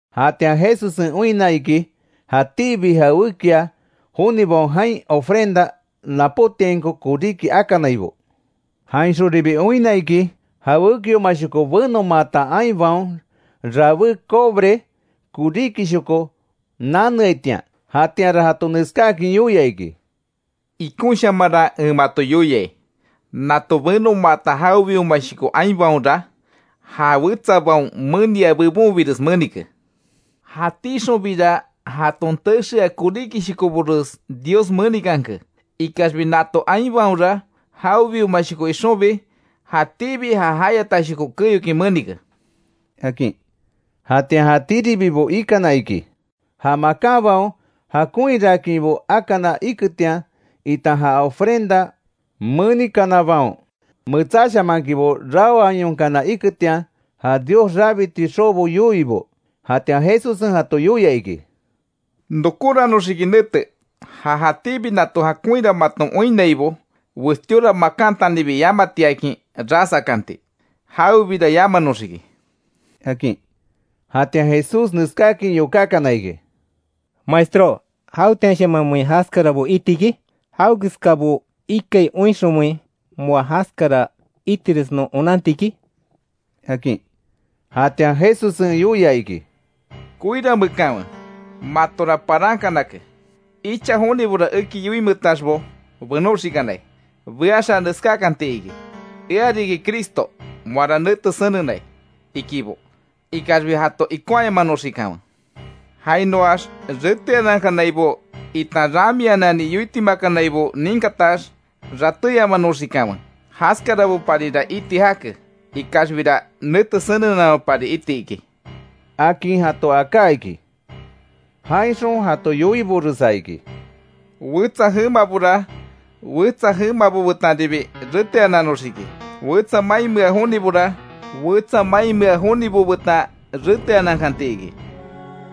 Jatian Jesussen oinna iki; jatíbi jawékia jonibaon jain ofrenda napótiainko koríki akanaibo. Jainxonribi oinna iki, jawékiomashoko benomaata ainbaon rabé cobre koríkishoko naneaitian. Jatianra jato neskáakin yoia iki: —Ikonshamanra en mato yoiai; nato benomaata jawebiomashoko ainbaonra, ja wetsabaon menia bebonbires menike. Jatíxonbira jaton texea koríkishokobores Dios menikanke. Ikaxbi nato ainbaonra, jawebiomashoko ixonbi, jatíbi já jayatashoko keyokin menike —akin. Jatian jatíribibo ikana iki, ja makanbaon jakonhiraakinbo akana iketian itan ja ofrenda menikanabaon, metsáshamaankinbo raoayonkana iketian; ja Dios rabiti xobo yoiibo. Jatian Jesussen jato yoia iki: —Nokóranoxiki nete, ja jatíbi nato jakonhira maton oinnaibo, westíora makantanibi yamatiakin ras akanti. Jawebira yamanoxiki —akin. Jatian Jesús neskáakin yokákana iki: —Maestró ¿Jawetianshamanmein jaskarabo iti iki? ¿Jawekeskabo ikai oinxonmein, moa jaskara itires non onanti iki? —akin. Jatian Jesussen yoia iki: “Koiramekanwe matora parankanake; icha jonibora eki yoinmeetaxbo benóxikanai. Beaxa neskákanti iki: ‘Ea riki Cristo’, ‘Moara nete senenai’, ikibo. Ikaxbi jato ikonhayamanoxikanwe. Jainoax reteanankanaibo itan ramianani yoitimakanaibo ninkatax ratéyamanoxikanwe, jaskaraboparira iti jake. Ikaxbira nete senenamapari iti iki”, akin jato aká iki. Jainxon jato yoiboresa iki: “Wetsa jemabora wetsa jemabo betanribi reteananoxiki, wetsa mainmea jonibora wetsa mainmea jonibo betan reteanankanti iki.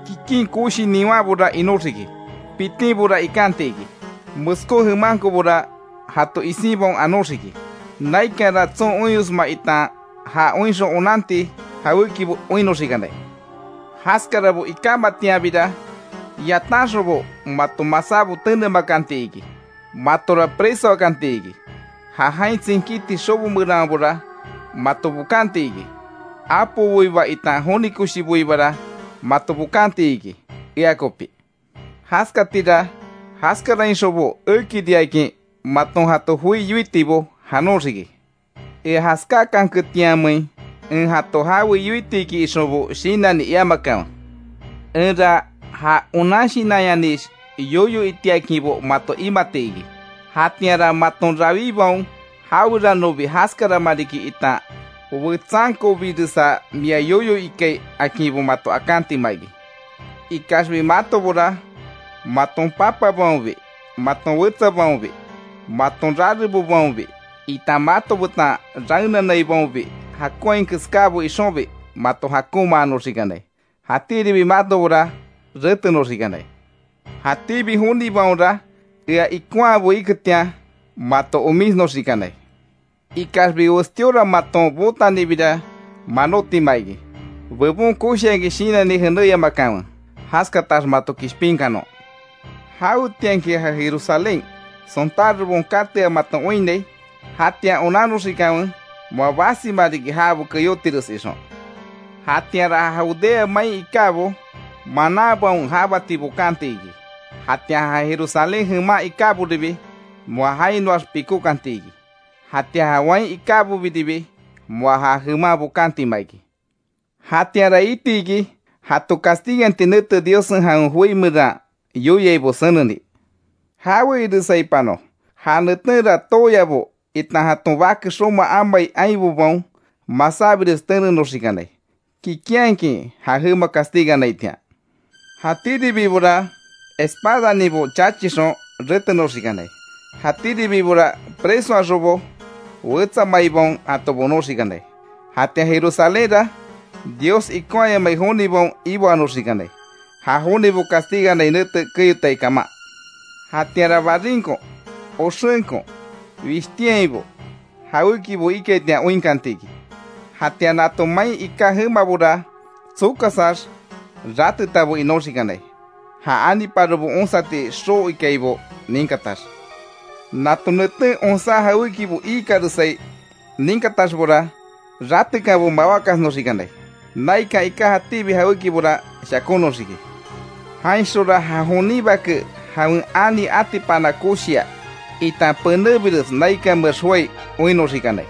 Kikin koshi niwanbora inoxiki, pitinbora ikanti iki, meskó jemankobora jato isinbaon anóxiki. Naikanra tson oinyosma itan ja oinxon onanti jawékibo oinnoxikanai. Jaskarabo ikámatianbira, yatanxonbo mato masábo tenemakanti iki, matora presoakanti iki. Ja jain tsinkíti xobo meranbora mato bokanti iki, apoboiba itan joni koshiboibara mato bokanti iki, ea kopi. Jaskatira, jaskarainxonbo ekiriakin maton jato joi yoitibo janoxiki. Ea jaskáakanketianmein en jato jawe yoiti iki ixonbo shinanni iamakanwe. Enra ja onan shinanyanix yoyo itiakinbo mato imati iki. Jatianra maton rawibaon, jaweranobi jaskarama riki itan wetsankobiresa mia yoyo ikai akinbo mato akantima iki. Ikaxbi matobora maton papabaonbi, maton wetsabaonbi, maton rarebobaonbi, itan mato betan raenanaibaonbi, jakonhai keskábo ixonbi, mato jakonmaanoxikanai. Jatíribi matobora, retenoxikanai. Jatíbi jonibaonra ea ikonhabo iketian mato omísnoxikanai. Ikaxbi westíora maton bootanibira, manótima iki. ¡Bebon koshiakin shinanni jenéyamakanwe; jaskatax mato kishpinkanon! Jawetianki ja Jerusalén, sontárobaon katea maton oinnai, jatian onanoxikanwe moa basima riki jabo keyótires ixon. Jatianra ja Judea main ikábo, mananbaon jabati bokanti iki. Jatian ja Jerusalén jeman ikáboribi, moa jainoax pikókanti iki, jatian ja wain ikábobiribi, moa ja jeman bokantima iki. Jatianra iti iki, jato castiganti nete Diossen jawen joi meran yoiaibo seneni. ¡Jawe iresaipanon, ja netenra tooyabo itan jaton bake xoma amai ainbobaon masábires tenenoxikanai! Kikinhakin ja jema castiganaitian. Jatíribibora espadaninbo chachixon retenoxikanai, jatíribibora presoaxonbo, wetsa maibaon jato bonoxikanai. Jatian Jerusalénra Dios ikonhaayamai jonibaon iboanoxikanai, ja jonibo castiganai nete keyotai kaman. Jatianra barinko, oxenko, wishtiainbo jawékibo ikaitian oinkanti iki. Jatian nato main iká jemabora tsokasax ratetabo inoxikanai, ja aniparobo onsati xoo ikaibo ninkatax. Nato neten onsá jawékibo iikaresai ninkataxbora, ratekanbo mawákasnoxikanai; naikan iká jatíbi jawékibora shakónoxiki. Jainxonra ja jonin Bake jawen ani atipana koshia, itan penébires naikanmeax joái oinnoxikanai.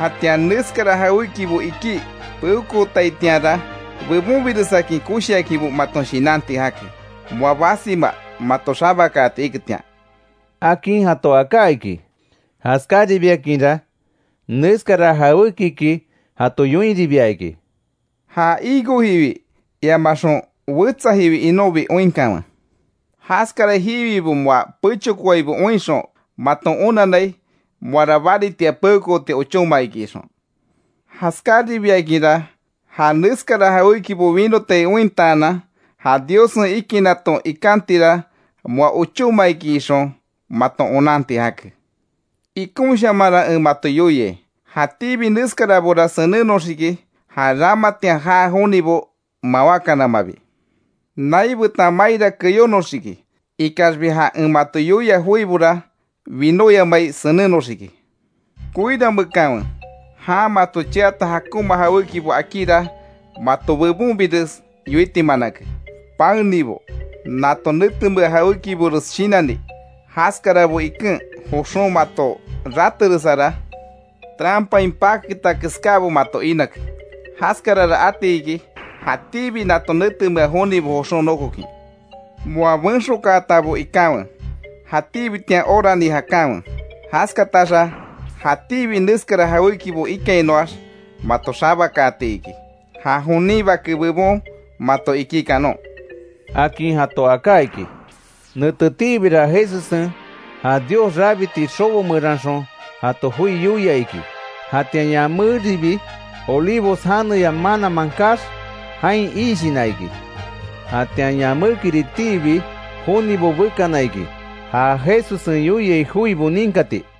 Jatian neskara jawékibo ikí peokootaitianra, bebonbiresakin koshiakinbo maton shinanti jake, moa basima mato xabakaati iketian”, akin jato aká iki. Jaskáribiakinra neskara jawékiki jato yoinribia iki: “Ja higo jiwi iamaxon wetsa jiwi inonbi oinkanwe. Jaskara jiwibo moa pechokoaibo oinxon, maton onanai, moara baritia peokooti ochóma iki ixon. Jaskaribiakinra, ja neskara jawékibo winotai ointaanan, ja Diossen ikinaton ikantira moa ochóma iki ixon maton onanti jake. Ikonshamanra en mato yoiai, jatíbi neskarabora senenoxiki, ja ramatian jaa jonibo mawákanamabi. Nai betan maira keyónoxiki, ikaxbi ja en mato yoia joibora winóyamai senennoxiki. Koiramekanwe jan mato cheata jakonma jawékibo akíra, mato bebonbires yoitimanake. Paenibo, nato netemea jawékibores shinanni. Jaskarabo iken joxon mato rateresara, trampain paketa keskábo mato inake. Jaskarara ati iki, jatíbi nato netemea jonibo joxon nokokin. Moa benxokaatabo ikanwe, jatíbitian orani jakanwe, jaskataxa jatíbi neskara jawékibo ikainoax mato xabakaati iki, ja jonin Bake bebon mato ikí kanon”, akin jato aká iki. Netetiibira Jesussen ja Dios rabiti xobo meranxon jato joi yoia iki; jatian yaméribi Olivos janeya mananman kaax, jain iishina iki. Jatian yamékiritiibi jonibo bekana iki; ja Jesussen yoiai joibo ninkati.